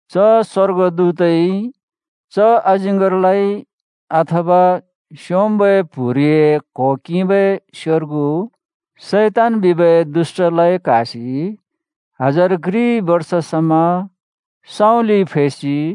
च स्‍वर्गदूतइ च अजिङ्गरलाइ, अथवा स्‍योंम्‍बै प्‍हुरिए क्हो किंबै स्‍योर्गु, शैतान बिबै दुष्‍टलाइ क्‍हासि हजार घ्रि बर्ष समा सँउँलिइ फैसि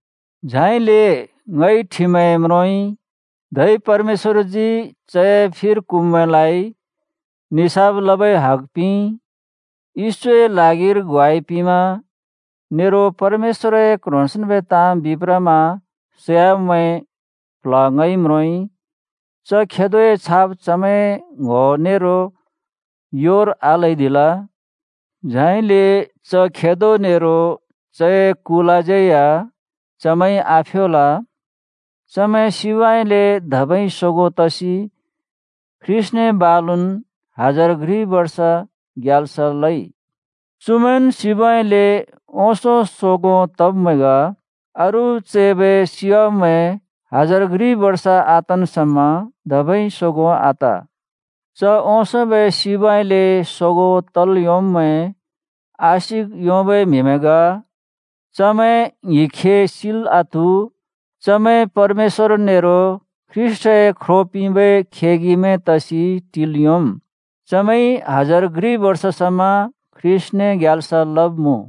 झाइले ङइ ठिमैं म्रोंइ। धै परमेश्‍वरजी चए फिर क्हुँब्मैंलाइ निसाफ लबै हग पिंइ। येशूए ल्हागिर ग्वाइ पिंमा नेरो परमेश्‍वरए क्ह्रोंसेंन्बै ताँ बिप्रमा सैवाब्मैंए प्‍ल्‍ह ङइ म्रोंइ। च खेदोए छाप चमैंए ङ्‌हो नेरो योर आल्‍हैदिल, झाइले च खेदो नेरो चए कुलाज्यै या चमैंइ आफ्योल। चमैं सिबउँइँले धबै सोगों तसि ख्रीष्‍टने बालुन् हजार घ्रि बर्ष ग्याल्स लइ। चुमैंन् सिबउँइँले ओंसों सोगों तब्मैं ग। अरू चैबै सियाब्‍मैं हजार घ्रि बर्ष आतन् समा धबै सोगों आत। च ओंसोंबै सिबउँइँले सोगों तल् योंब्‍मैं आशिक योंबै म्‍हिमैं ग, चमैं ङ्हिंखे सिल् आत्‍हु। चमैं परमेश्‍वर नेरो ख्रीष्‍टए ख्रो पिंबै खेगिमैं तसि टिल् योंम्। चमैंइ हजार घ्रि बर्ष समा ख्रीष्‍टने ग्याल्स लब्‍मुँ।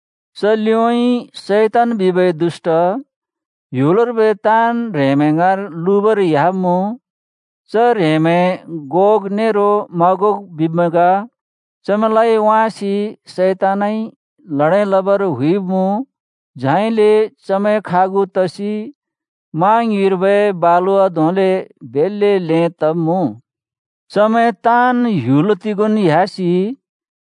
च लिउँइँ शैतान बिबै दुष्‍ट ह्‍युलर्बै ताँन् ह्रेंमैं ङाँर लुबर ह्‍याब्मुँ। (च ह्रेंमैं गोग नेरो मागोग बिब्‍मैं ग।) चमैंलाइ वाँसि शैतानइ ल्हडें लबर हुइब्‍मुँ। झाइले चमैं खागु तसि मा ङ्युँइर्बै बालुवा धोंले बेल्‍ले ल्हें तब्‍मुँ। चमैं ताँन् ह्‍युल तिगोंन् ह्‍यासि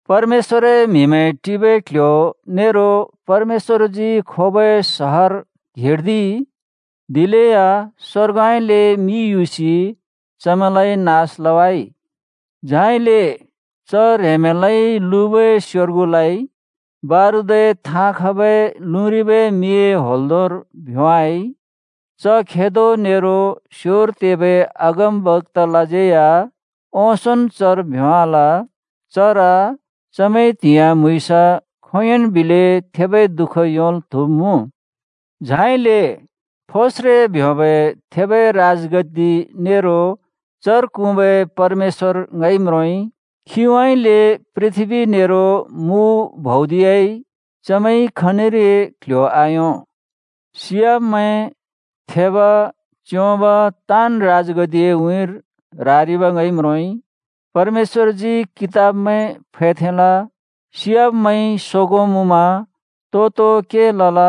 परमेश्‍वरए म्‍हिमैं टिबै क्‍ल्‍ह्‍यो नेरो परमेश्‍वरजी खोबै सहर घेर्दिइ। दिलेया स्‍वर्गउँइँले मि युसि चमैंलाइ नास लवाइ। झाइले च ह्रेंमैंलाइ लुबै स्योर्गुलाइ बारुदए थाँ खबै लुँरिबै मिए होंल्दोंर भ्‍योंवाइ। च खेदो नेरो स्योर तेबै अगमबक्‍तालाज्यै या ओंसोंन् चर भ्‍योंवाल। चर चमैंइ त्‍हिंयाँ म्‍हुँइँस खोंयोंन् बिलै थेबै दुःख योंल् त्‍हुब्‍मुँ। झाइले फोस्रे ब्योंबै थेबै राजगद्दि नेरो चर क्हुँबै परमेश्‍वर ङइ म्रोंइ। खीउँइँले पृथ्‍बी नेरो मु भौदियाइ, चमैंइ खनिरै क्ल्ह्‍यो आयों। सियाब्‍मैं, थेब, च्‍योंब ताँन् राजगद्दिए उँइँर रारिब् ङइ म्रोंइ। परमेश्‍वरजी कितबमैं फैथेंल। सियाब्‍मैंइ सोगों मुँमा तो तो के लल,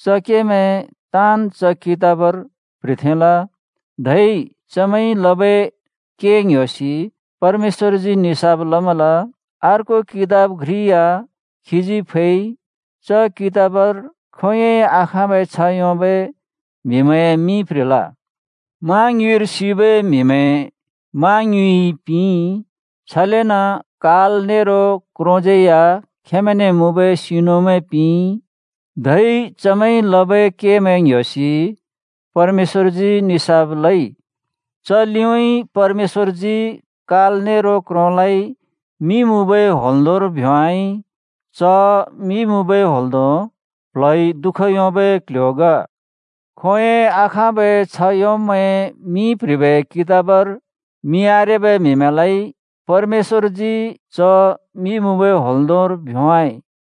च केमैं ताँन् च कितबर प्‍ह्रिथेंल। धै चमैंइ लबै के ङ्‍ह्‍योसि परमेश्‍वरजी निसाफ लमल। (अर्को कितब घ्रि या खीजी फैइ। च कितबर खोंयोंइ आखाँबै छ्ह योंबै म्हिमैंए मिं प्‍ह्रिल।) मा ङ्युँइर सिबै म्‍हिमैं मा ङ्युँइइ पिंइ, छलेन काल नेरो क्रोज्यै या खेंमैंने मुँबै सिनुमैं पिंइ। धै चमैंइ लबै केमैं ङ्‍ह्‍योसि परमेश्‍वरजी निसाफ लइ। च लिउँइँ परमेश्‍वरजी काल नेरो क्रोंलाइ मि मुँबै होंल्दोंर भ्‍योंवाइ। च मि मुँबै होंल्दों प्ल्हइ दु:ख योंबै क्ल्ह्‍यो ग। खोंयोंइ आखाँबै छ्ह योंब्मैंए मिं प्‍ह्रिबै कितबर मिं आरेबै म्‍हिमैंलाइ परमेश्‍वरजी च मि मुँबै होंल्दोंर भ्‍योंवाइ।